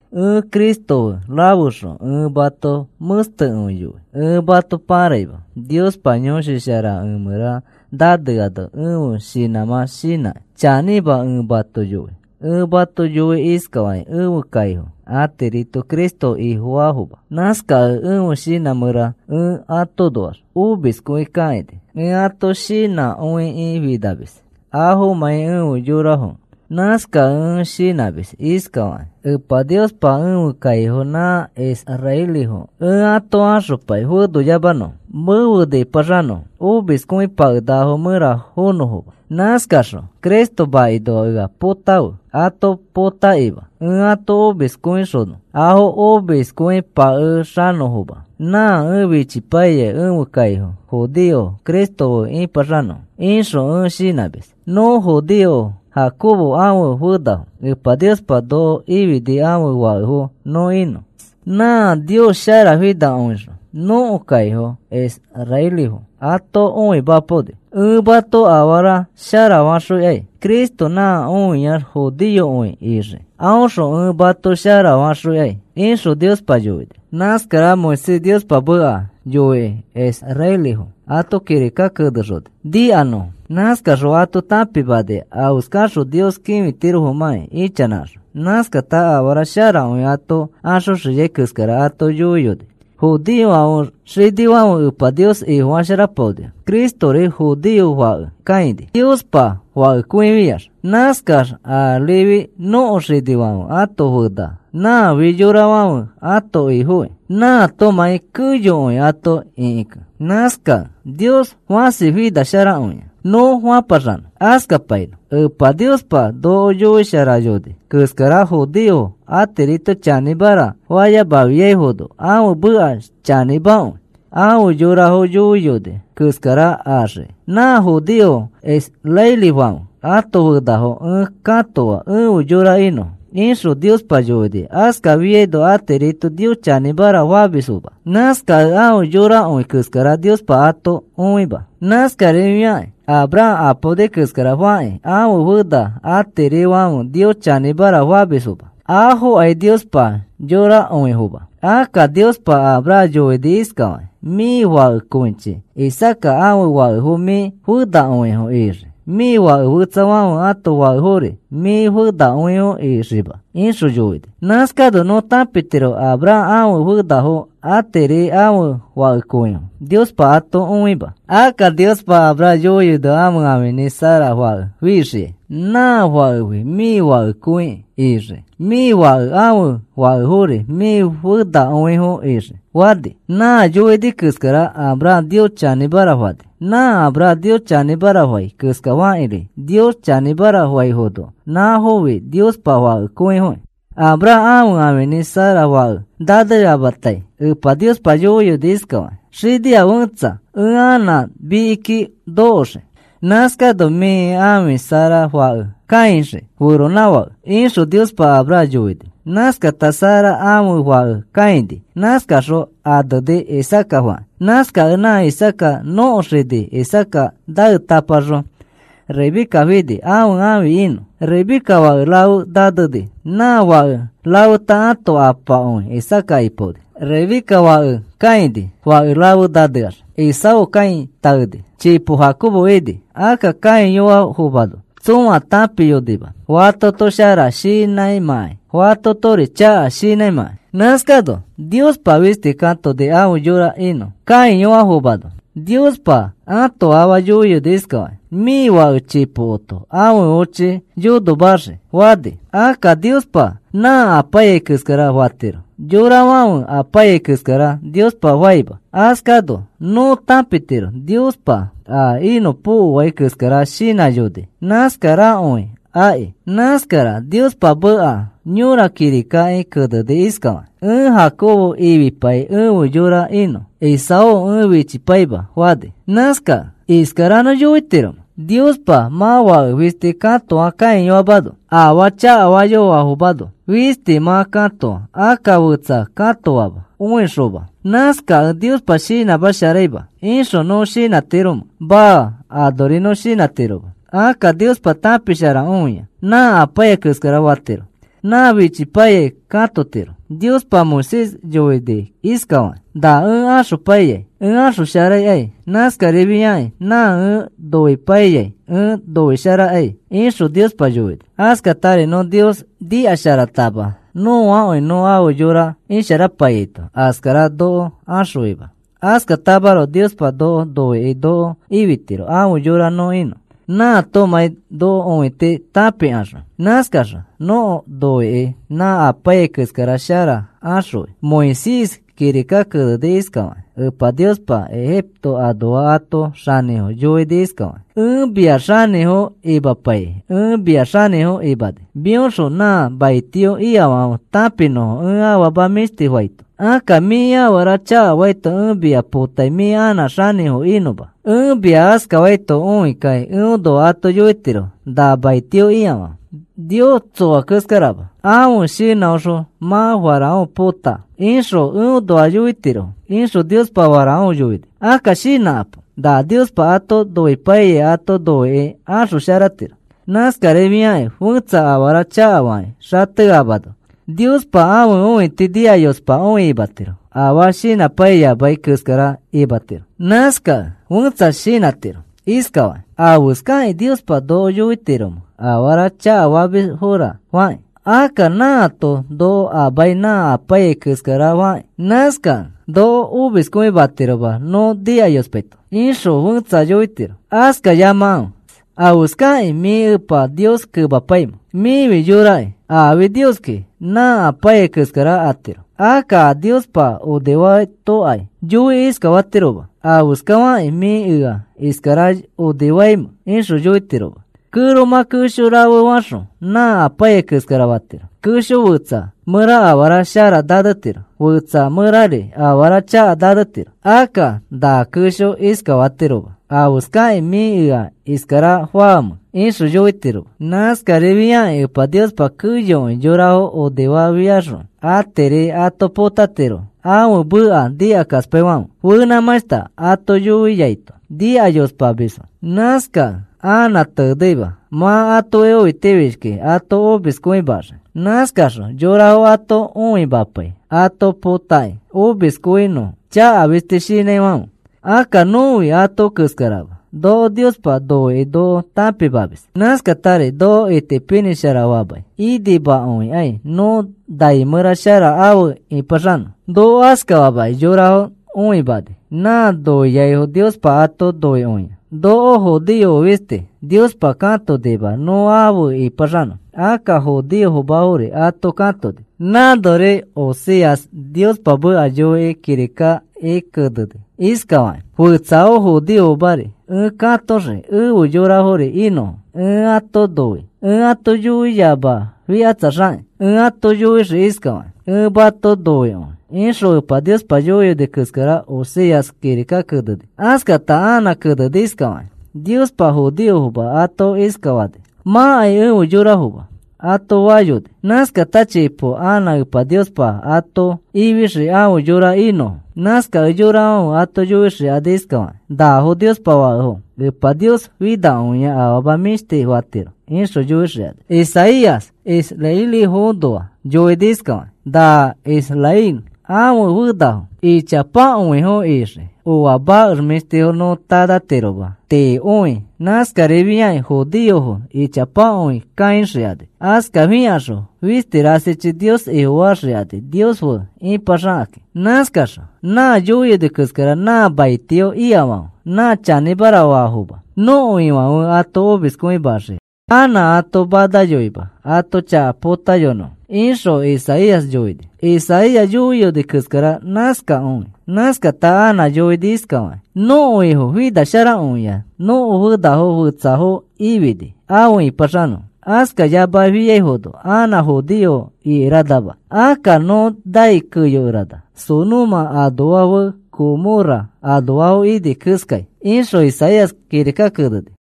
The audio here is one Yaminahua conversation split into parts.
Ẽ Cristo fe rafexõ ẽ mato mẽstekõi yoi. Ẽ mato pãraima. Niospa Yõshi Shara ẽ mẽra naneano ẽfe shinãmã shinãkĩ chanĩma ẽ mato yoi. Ẽ mato yoi iskafakĩ, ẽfe kaifo atirito Cristo Ifofaafoma. Nãskakẽ ẽfe shinã mẽra ẽ atoõnoax omiskõi kakaini. Ẽ ato shinãkõikĩ finamis afomãi efe yorafokẽ. Nãskakẽ ẽ shinãmis iskafakĩ: “Epa Niospa, ẽfe kaifo nã israelifo ẽ ato axopai fenoyamanõfo, mefe nipaxanõfo omiskõipakenakafo mẽra fonõfoma. Nãskaxõ Cristo makinoa ea potãfe ato potakima ẽ ato omiskõixonõ afo omiskõipakexanõfoma. Nã ẽ fichipai ẽfe kaifo judeofo Cristo fe ĩpaxanõfo,” ixõ ẽ shinãmis. Nõ judeofo, Jacobo ãfe fenafo. Epa Niospa noko ifini ãfe fakefo nõ inõ. Nãa Nios sharafinakõixõ nõko kaifo israelifo ato õimapaoni. “Ẽ mato afara sharafaxõikai. Cristo nã oxiai judeokõi ixii. Aõxõ ẽ mato sharafaxõikai,” ixõ Niospa yoini. Nãskara Moisés Niospa meka yoikĩ israelifo ato kirika kenexoni nikanõfo. Nãskaxõ ato tãpimani afeskaxõ Nios kĩfitirofomãki ichanãxõ. Nãskata afara sharakõi ato axoxiai keskara ato yoiyoni. Judeofãfe xinifãfe Epa Nios Ifofasharapaonifo. Cristori judeo fake kãini, Niospa Fakekõifiax. Nãskax arifi nõko xinifãfe ãto fena. Nãfi yorafãfe ãto Ifokĩ, nãatomãi keyokõi ato ĩkikẽ. Nãskakẽ, “Nios fãsi finasharakõia,” nõ fapaxanõ. Askapainõ. Epa Niospa noko yoisharayoni keskara judeofo atirito chanĩmara fayamafiaifono ãfe meka chanĩmakõi. Afe yorafo yoiyoni keskara axii. “Nã judeofo Israelifãfe ãto fenafo ẽ katoa efe yora inõfo,” ixõ Niospa yoini. Askafafiano atirito Nios chanĩmara famisfoma. Nãskakẽ afe yorakõi keskara Niospa ato õima. Nãskarifiakakĩ Abraham apaoni keska fakĩ ãfe fena atirifãfe Nios chanĩmara famisfoma. Afokai Niospa yorakõifoma. Akka Niospa Abraham yoini iskafakĩ: “Mĩ fakekõichi Isaaca ãfe fakefo mĩ fenakõifo ixii, mĩ fake fetsafãfe ãto fakefori mĩ fenakõifo ixiima,” ixõ yoini. Nãskano nõ tãpitiro Abraham ãfe fenafo atiri ãfe fakekõifo Niospa ato õima. Akka Niospa Abraham yoiyoni ãfe ãfinĩ Sara fake fixiai. “Nã fakefi mĩ fakekõi ixii. Mĩ fakẽ ãfe fakefori mĩ fenakõifo ixii,” fani. Nã yoini keskara Abraham Nios chanĩmara fani. Nã Abraham Nios chanĩmara fai keskafakĩri Nios chanĩmara faifono nãfofi Niospa fakekõifoki. Abraham ãfe ãfinĩ Sara fake naneamatai Epa Niospa yoiyoni iskafakĩ: “Xinia fẽtsa ẽ anã mikiki nokoxii. Nãskano mĩ ãfi Sara fake kãixii feronãfake,” ixõ Niospa Abraham yoini. Nãskata Sara ãfe fake kãini. Nãskaxõ aneni, Isaaca fakĩ. Nãskakẽ nã Isaaca nõko xini. Isaaca naetapaxõ Rebeca fini ãfe ãfi inõ. Rebeca fake rafe naneni. Nã fake rafeta ãto apakõi Isaaca ipaoni. Rebeca fake kãini fake rafe naneax. Esaú kãi taeni. Chipo Jacobo ini. Akka kãiyoafomano tsõa tãpiyonima fatoto shara shinãimãkai, fatotori chaka shinãimãkai. Nãskano Niospa fisti katoni afe yora inõ. Kãiyoafomano Niospa ãto afa yoiyoni iskafakĩ: “Mĩ fake chipokoto ãfe ochi yonomaxii,” fani. Akka Niospa nã apaiyai keskara fatiro, yorafãfe apaiyai keskara Niospa faima. Askano nõ tãpitiro Niospa a inõpokoai keskara shinãyoni nãskarakõi aki. Nãskara Niospa meka yõra kirikaki keneni iskafakĩ: “Ẽ Jacobo ifipai efe yora inõ. Esaú ẽ fichipaima,” fani. Nãskakẽ ¿iskara nõ yoitiromẽ, “Niospa mã fake fisti katoa kãiyoafomano, afaa chakafayoafomano fisti mã katoa akka fetsa katoama õixoma. Nãskakẽ Niospa shinãsharaima,” ixõ nõ shinãtiromẽ? Maa, anori nõ shinãtiroma. Akka Niospa tãpisharakõia. Nã apaiyai keskara fatiro. Nã fichipaiyai katotiro. Niospa Moisés yoini iskafakĩ: “Nã ẽ axopaiyai ẽ axosharaikai. Nãskarifiakĩ nã ẽ noipaiyai ẽ noisharaikai,” ixõ Niospa yoini. Askatari nõ Nios nikasharatama nõakõi nõ afe yora isharapaiyaito askara noko axõima. Askatamaroko Niospa noko noikĩ noko ifitiro afe yora nõ inõ, nãatomãi noko õiti tãpikaxõ. Nãskaxõ noko noikĩ nã apaiyai keskara shara axõi. Moisés kirika keneni iskafakĩ: “Epa Niospa Egipto anoa ãto xanĩfo yoini iskafakĩ: ‘Ẽ mia xanĩfo imapaikĩ ẽ mia xanĩfo imani mĩoxõ nã maitio ikafãfe tãpinõfo ẽ afama mĩshti faito. Akka mĩ afara chakafaito ẽ mia potai mĩ anã xanĩfo inõma. Ẽ mia askafaito õikakĩ eõnoa ato yoitirofo nã maitio ikafãfe: “Nios tsoa keskarama ãfe shinãõxõ mã Faraón pota,” ixõ eõnoa yoitirofo,’ ixõ Niospa Faraón yoini.” Akka shinãkapo. Nã Niospa ato noipaiyai ato noikĩ axosharatiro. Nãskarifiakĩ fẽtsa afara chakafakĩ xateamano Niospa ãfe õiti nikayospakõi imatiro afaa shinãpaiyamai keskara imatiro. Nãskakẽ fẽtsa shinãtiro iskafakĩ: “¿Afeskakĩ Niospa noko yoitiromẽ afara chakafamisfora fakĩ? Akka nãato noko amai nã apaiyai keskarafakĩ. Nãskakẽ noko omiskõimatiroma nõ nikayospaito,” ixõ fẽtsa yoitiro. Askafayamafe. ¿Afeskakĩ mĩ Epa Nios kemapaimẽ? Mĩfi yoraki. Aafi Nioski nã apaiyai keskara atiro. Akka a Niospa onifatokai yoikĩ iskafatiroma: “¿Afeskafakĩ mĩ ea iskara onifaamẽ?” ixõ yoitiroma. Kẽromã kesho rafe faxõ nã apaiyai keskara fatiro. Kesho fetsa mẽra afara shara nanetiro, fetsa mẽrari afara chaka nanetiro. Akka na kẽsho iskafatiroma: “¿Afeskakĩ mĩ ea iskara faamẽ?” ixõ yoitiroma. Nãskarifiakĩ Epa Niospa keyokõi yorafo onifafiaxõ atiri ato potatiro ãfe meka nikakaspaifãfe. Fenãmãshta ato yoiyofiaito nikayospamisfo. Nãskakẽ anã teneima, mã atoki õitifishkikĩ ato omiskõimaxii. Nãskaxõ yorafo ato õimapai ato potakĩ omiskõinõfo chaka fisti shinãifãfe. Akka nõfi ato keskarama. Noko Niospa noikĩ noko tãpimamis. Nãskatari noko itipinĩsharafamai inimakõikai nõ nai mẽra shara afe ĩpaxanõ. Noko askafamakĩ yorafo õimani nã noiaifo Niospa ato noikõia. Noko judeofo fisti Niospa katonima nõ afe ĩpaxanõ. Akka judeofomafori ato katoni. Nãnori Oseas Niospa meka yoikĩ kirikaki keneni iskafakĩ: Fetsafo judeofomari ẽ katoxii efe yorafori inõfo. “Ẽ mato noi,” ẽ ato yoiyamafikatsaxakĩ, ẽ ato yoixii iskafakĩ: “Ẽ mato noikõi,” ixõ Epa Niospa yoini keskara Oseas kirikaki keneni. Askata anã keneni iskafakĩ: Niospa judeofoma ato iskafani: “Mãkai efe yorafoma,” ato fayoni. Nãskata chipo anã Epa Niospa ato ifixii afe yora inõfo. Nãskakẽ yorafãfe ato yoixikani iskafakakĩ: “Nafo Niospa fakefo. Epa Nios finakõia afama mĩshti fatiro,” ixõ yoixikani. Isaías israelifoõnoa yoini iskafakĩ: “Na Israel ãfe fenafo ichapakõifo ixii oa makex mĩshtifo nõ tanãtiroma tiikõi. Nãskarifiai judeofo ichapakõi kaixikani. Askafikaxõ fisti rasichi Nios Ifofaxikani Nios fe ipaxakakĩ. Nãskaxõ nã yoiyoni keskara nã maitio ikafãfe nã chanĩmara faafoma. Nõko Ifãfe ato omiskõimaxii anã ato manayoima ãto chaka potayonõfo,” ixõ Isaías yoini. Isaías yoiyoni keskara nãskakõi. Nãskata anã yoini iskafakĩ: Nõko Ifo finasharakõia nõko fenafo fetsafo ifini afe ĩpaxanõfo. Askafayamafiano anã judeofo ikeranama. Akka nõ nai keyokerana Sodoma anoa fe Gomorra anoafo ini keskai, ixõ Isaías kirika keneni.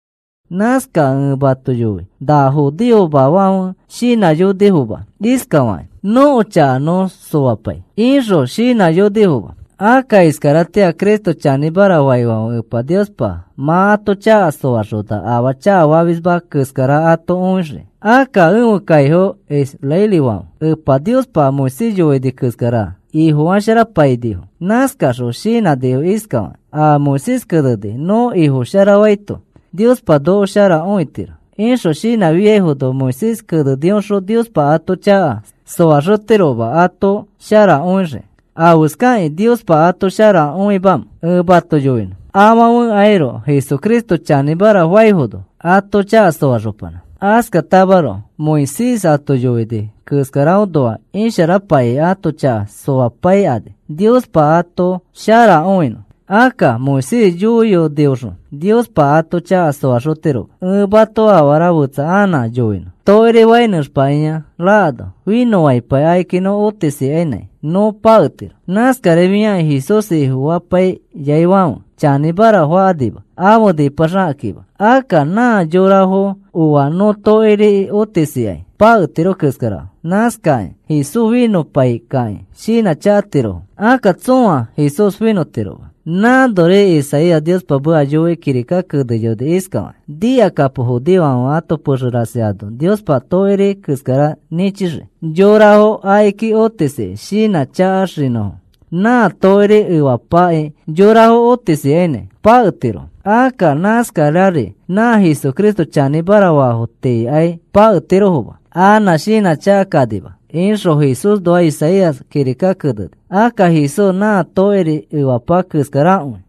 Nãskakẽ ẽ mato yoi. Nã judeofomafãfe shinãyonifoma iskafakakĩ: “Nõko chaka nõ soapai,” ixõ shinãyonifoma. Akka iskaratĩa Cristo chanĩmara faifãfe Epa Niospa mã ato chaka soaxona afaa chakafamisma keskara ato õixiki. Akka ẽfe kaifo israelifãfe Epa Niospa Moisés yoini keskara ifo sharafapainifo. Nãskaxõ shinãnifo iskafakakĩ: “A Moisés keneni nõ ifofasharaito Niospa noko shara õitiro,” ixõ shinãfiaifono Moisés kenenioxõ Niospa ato chaka soaxotiroma ato shara õixiki. ¿Afeskakĩ Niospa ato shara õimamẽ? Ẽ mato yoinõ. Afãfekairoko Jesucristo chanĩmara faifono ato chaka soaxopanã. Askatamaroko Moisés ato yoini keskaraõnoax isharapaikĩ ãto chaka soapaikani Niospa ato shara õinõ. Akka Moisés yoinioxõ Niospa ato chaka soaxotiroma. Ẽ mato afara fetsa anã yoinõ. Tokiri fai nẽxpakĩa rakano finõpai akiki nõ otisikainãi nõ paketiro. Nãskarifiakĩ Jesús finõpaiyaifãfe chanĩmara fakanima afe nĩpãxakakĩma. Akka nã yorafo oa nõ tokiriki otisikai paketiro keskarafo. Nãskakĩ Jesús finõpaikakĩ shinãchakatirofo. Akka tsõa Jesús finõtiroma. Nãnori Isaías Niospa meka yoikĩ kirika keneyoni iskafakĩ: Nikakapo, judeofãfe ãto pexe rasi ano Niospa tokiri keskara nĩchixii yorafo akiki otisikĩ shinãchakaxinõfo. Nã tokiri efapaki yorafo otisikani paketirofo. Akka nãskarari nã Jesucristo chanĩmara faafo tiikai paketirofoma. Anã shinãchakakanima, ixõ Jesúsnoa Isaías kirika keneni. Akka Jesús nã tokiri efapa keskarakõi.